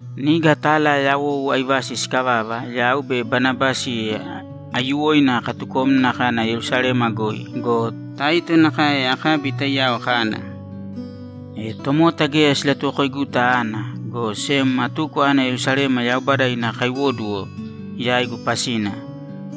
Niga tala yawou aivasi sikavava, yau be Banabasi aiyuwoina katukomna kana Yerusalema goi go, Taito nakae akabi taiyao kana. E tomota geya silatuwokoiguta ana, go sem atuko ana Yerusalema Yaubada ina kaiwóduwo yaigu pasina.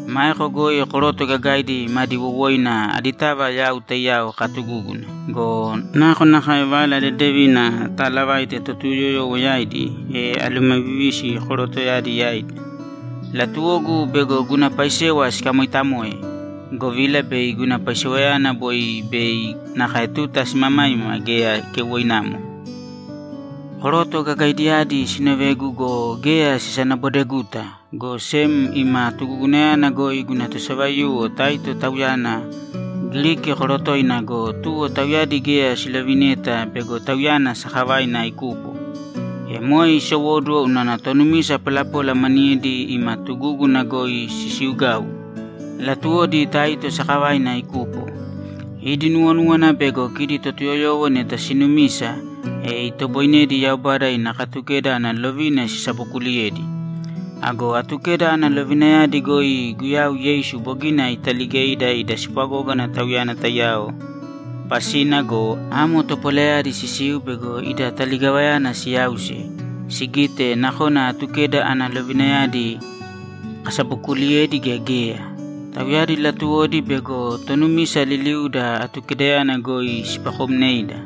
Maeko goi koroto gagaidi madi wowoina aditava yau taiyao katugúguna go, nakonakae Vala Dedevina ataalavaite Totuyoyowo yaidi, e alumavivisi korotoyadi yaidi. Latuwogu bego guna paisewa sikamoitamoe, govila bei guna paisewayana boi be nakae tuta simamaima geya keuwoinamo. Koroto gagaidiyadi sinovegu go, geya sisanabodeguta, go sem ima tugugunayana goi guna tosavaiyuwo Taito tauyana Giriki korotoina go, tuwo tauyadi geya silovineta bego tauyana sakavaina ikupo. E moe isowóduwo unana tonumisa polapola maniyedi ima tugúguna goi sisiugau; latuwodi Taito sakavaina ikupo. Idi nuwonúwana bego kidi Totuyoyowo neta sinumisa, e itoboinedi Yaubada ina Katukeda ana lovina sisabokuliyedi. Ago Atukeda ana lovinayadi goi Guyau Yeisu bogina italigeida ida spwagógana Tauyana taiyao pasina go, amo topolayadi sisiu bego ida taligavayana siyausi, sigite nakona Atukeda ana lovinayadi kasabokuliyedi gea geya. Tauyadi latuwodi bego tonumisa liliuda Atukedayana goi sipakomneida.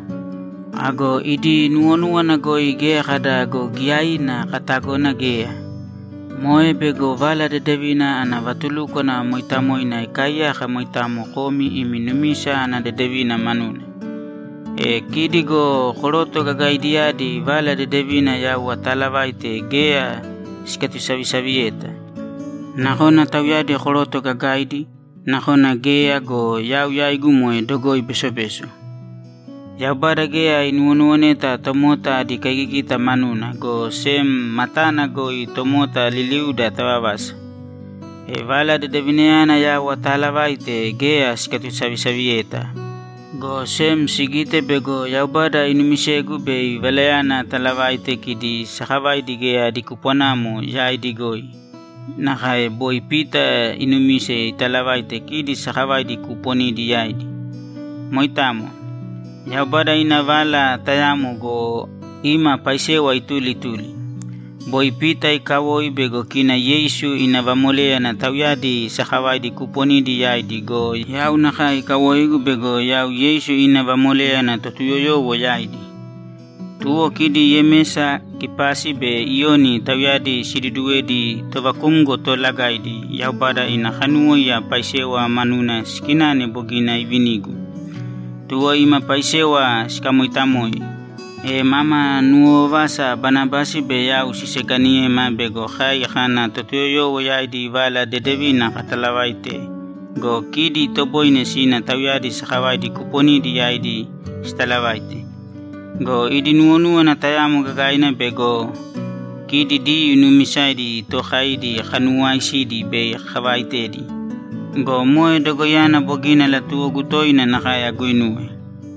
Ago idi nuwonúwana goi geya kada go giyaiina katagona geya. Moe bego Vala Dedevina ana vatulúkwana mooitamoina ikaaiyaka moitamo komi imi numisa ana dedevina manuna. E kidi go koroto gagaidiyadi Vala Dedevina yau ataalavaite geya sikatusavisaviyeta. Nakona tauyadi koroto gagaidi, nakona geya go, yau yaigu moe dogoi besobeso. Yaubada geya inuwonuwoneta tomota adi kaigigita manuna, go sem matana goi tomota liliuda tavavasa. E Vala Dedevinayana yau ataalavaite geya sikatusavisaviyeta, go sem sigite bego Yaubada inumisegu bei Valayana atalavaite kidi sakavaidi geya adi kupwanamo yaidi goi nakae boi Pita inumise italavaite kidi sakavaidi kuuponidi yaidi. Moitamo. Yaubada ina Vala tayamo go, ima paisewa ituli ituli. Boi Pita ikawoi bego kina Yeisu ina vamoléyana tauyadi sakavaidi kuuponidi yaidi go, yau nakae ikawoigu bego yau Yeisu ina vamoléyana Totuyoyowo yaidi. Tuwo kidi Yemesa, Kepasi be Iyoni, tauyadi siduuduwedi tovakumgo toolagaidi, Yaubada ina kanuwóiya paisewa manuna sikinane bogina ivinigu. Tuwo ima paisewa sikamoitamoe, e mama nuwovavasa Banabasi be yau siseikaniyema bego kai kana Totuyoyowo yaidi Vala Dedevina katalavaite go, kidi itoboine sina tauyadi sakavaidi kuuponidi yaidi sitalavaite. Go idi nuwonúwana tayamo gagaina bego kidi Diyuu nuumisaidi tookaidi kanuwaisidi bei kavaitedi. Go moe dogoiyana bogina latuwogu toina nakae aguinuwe.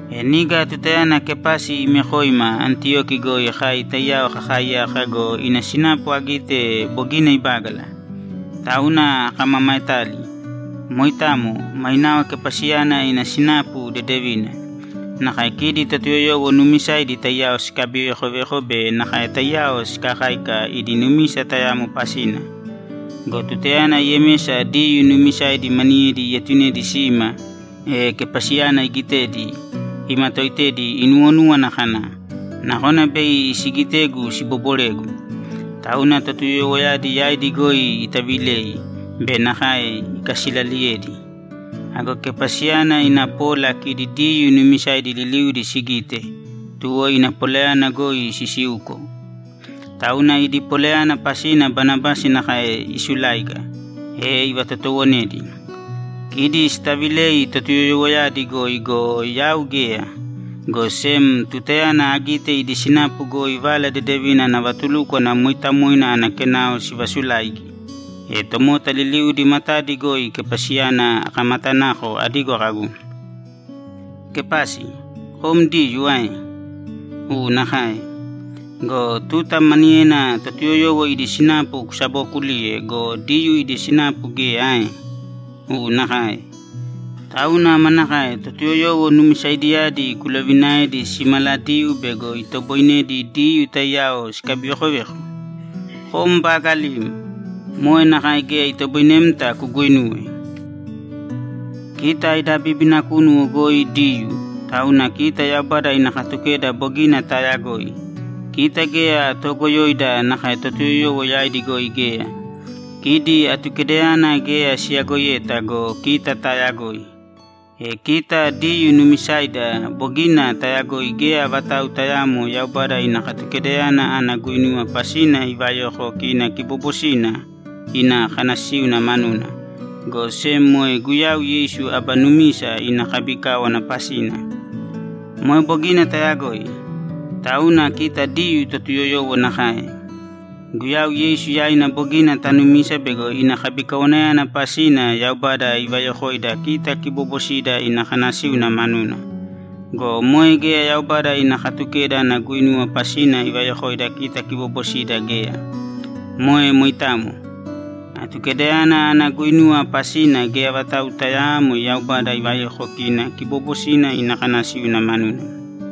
E niga tutayana Kepasi imekoima Antiyoki goi kai taiyao kakaaiyaka go, ina sinapu agite bogina ibágala. Tauna akamamaetali. Moitamo. Mainao Kepasiyana ina sinapu dedevina. Nakae kidi Totuyoyowo nuumisaidi taiyao sikabivekoveko be nakae taiyao sikakáika idi numisa tayamo pasina. Go tutayana Yemesa Diyuu nuumisaidi maniyedi ietunedi sima, e Kepasiyana igitedi, imatoitedi inuwonúwana kana, ‘Nakona bei sigitegu siboboregu.’ Tauna Totuyoyowoyadi yaidi goi itaavilei be nakae ikasilaaliyedi. Ago Kepasiyana ina pola kidi Diyuu nuumisaidi liliudi sigite, tuwo ina polayana goi sisiuko. Tauna idi polayana pasina Banabasi nakae isuláiga, e ivatotowonedi! Kidi sitavilei Totuyoyowoyadi goi go, yau geya, go sem tutayana agite idi sinapu goi Vala Dedevina ana vatulúkwana mooitamoina ana kenao sivasulaigi, e tomota liliudi matadi goi Kepasiyana akamatanako adigo kagu, ‘Kepasi, kom Diyuu ae? U nakae. Go tuta maniyena Totuyoyowo idi sinapu kusabookuliye go, Diyuu ida sinapu geya ae? U nakae. Tauna manakae Totuyoyowo numisaidiyadi kulovinaedi simaladiyuu bego itoboinedi Diyuu taiyao sikabivekoveko? Kom baagalim! Moe nakae geya itoboinemta kuguinuwe! Kita ida bíbina kunu goi Diyuu, tauna kita Yaubada ina Katukeda bogina taayagoi. Kita geya toogoyoida nakae Totuyoyowo yaidi goi geya. Kidi Atukedayana geya siyagoiyeta go, kita taayagoi. E kita Diyuu nuumisaida bogina tayagoi geya vatau tayaamo Yaubada ina Katukedayana ana guinuwa pasina ivayoko kina kiboobosina ina kanasíuna manuna, go sem moe Guyau Yeisu aba numisa ina kabikáwana pasina. Moe bogina tayagoi. Tauna kita Diyuu Totuyoyowo nakae; Guyau Yeisu yaina bogina tanumisa bego ina kabikawanayana pasina Yaubada ivayokoida kita kiboobosida ina kanasíuna manuna. Go moe geya Yaubada ina Katukeda ana guinuwa pasina ivayoko kita kiboobosida geya. Moe moitamo. Atukedayana ana guinuwa pasina geya vatau tayaamo Yaubada ivayoko kina kiboobosina ina kanasíuna manuna.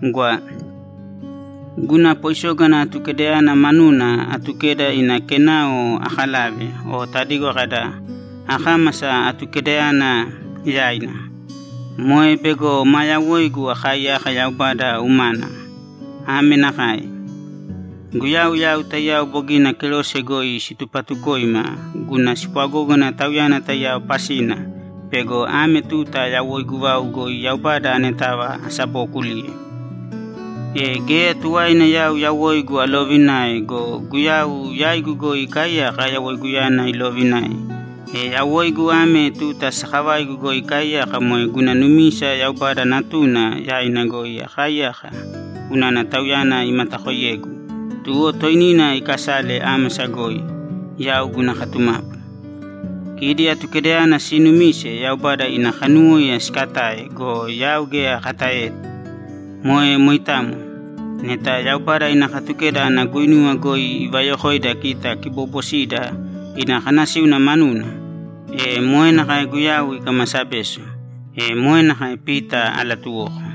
Gwa. Guna poisógana Atukedayana manuna Atukeda ina kenao akalave o tadigo kada, “Akámasa Atukedayana yaina.” Moe bego maa yawoigu akaaiyaka Yaubada umana. Ame nakae: Guyau yau taiyao bogina kerose goi situpatukoima guna spwagógana Tauyana taiyao pasina bego ame tuta yawoigu vau goi Yaubada anetava asabookuliye. E geya tuwaina yau yawoigu aloovinae go, Guyau yaigu goi ikaaiyaka yawoiguyana iloovinae. E yawoigu ame tuta sakavaigu goi akaaiyaka moe guna numisa Yaubada Natuna yaina goi akaaiyaka unana Tauyana imatakoiyegu, tuwo toinina ikasale ámasa goi, yau guna katumapu. Kidi Atukedayana siinumise Yaubada ina kanuwóiya sikatae go, yau geya akataeyeta. Moe moitamo. Neta Yaubada ina Katukeda ana guinuwa goi ivayokoida kita kiboobosida ina kanasíuna manuna, e moe nakae Guyau ikamasa beso.’ E moe nakae Pita alatuwoko.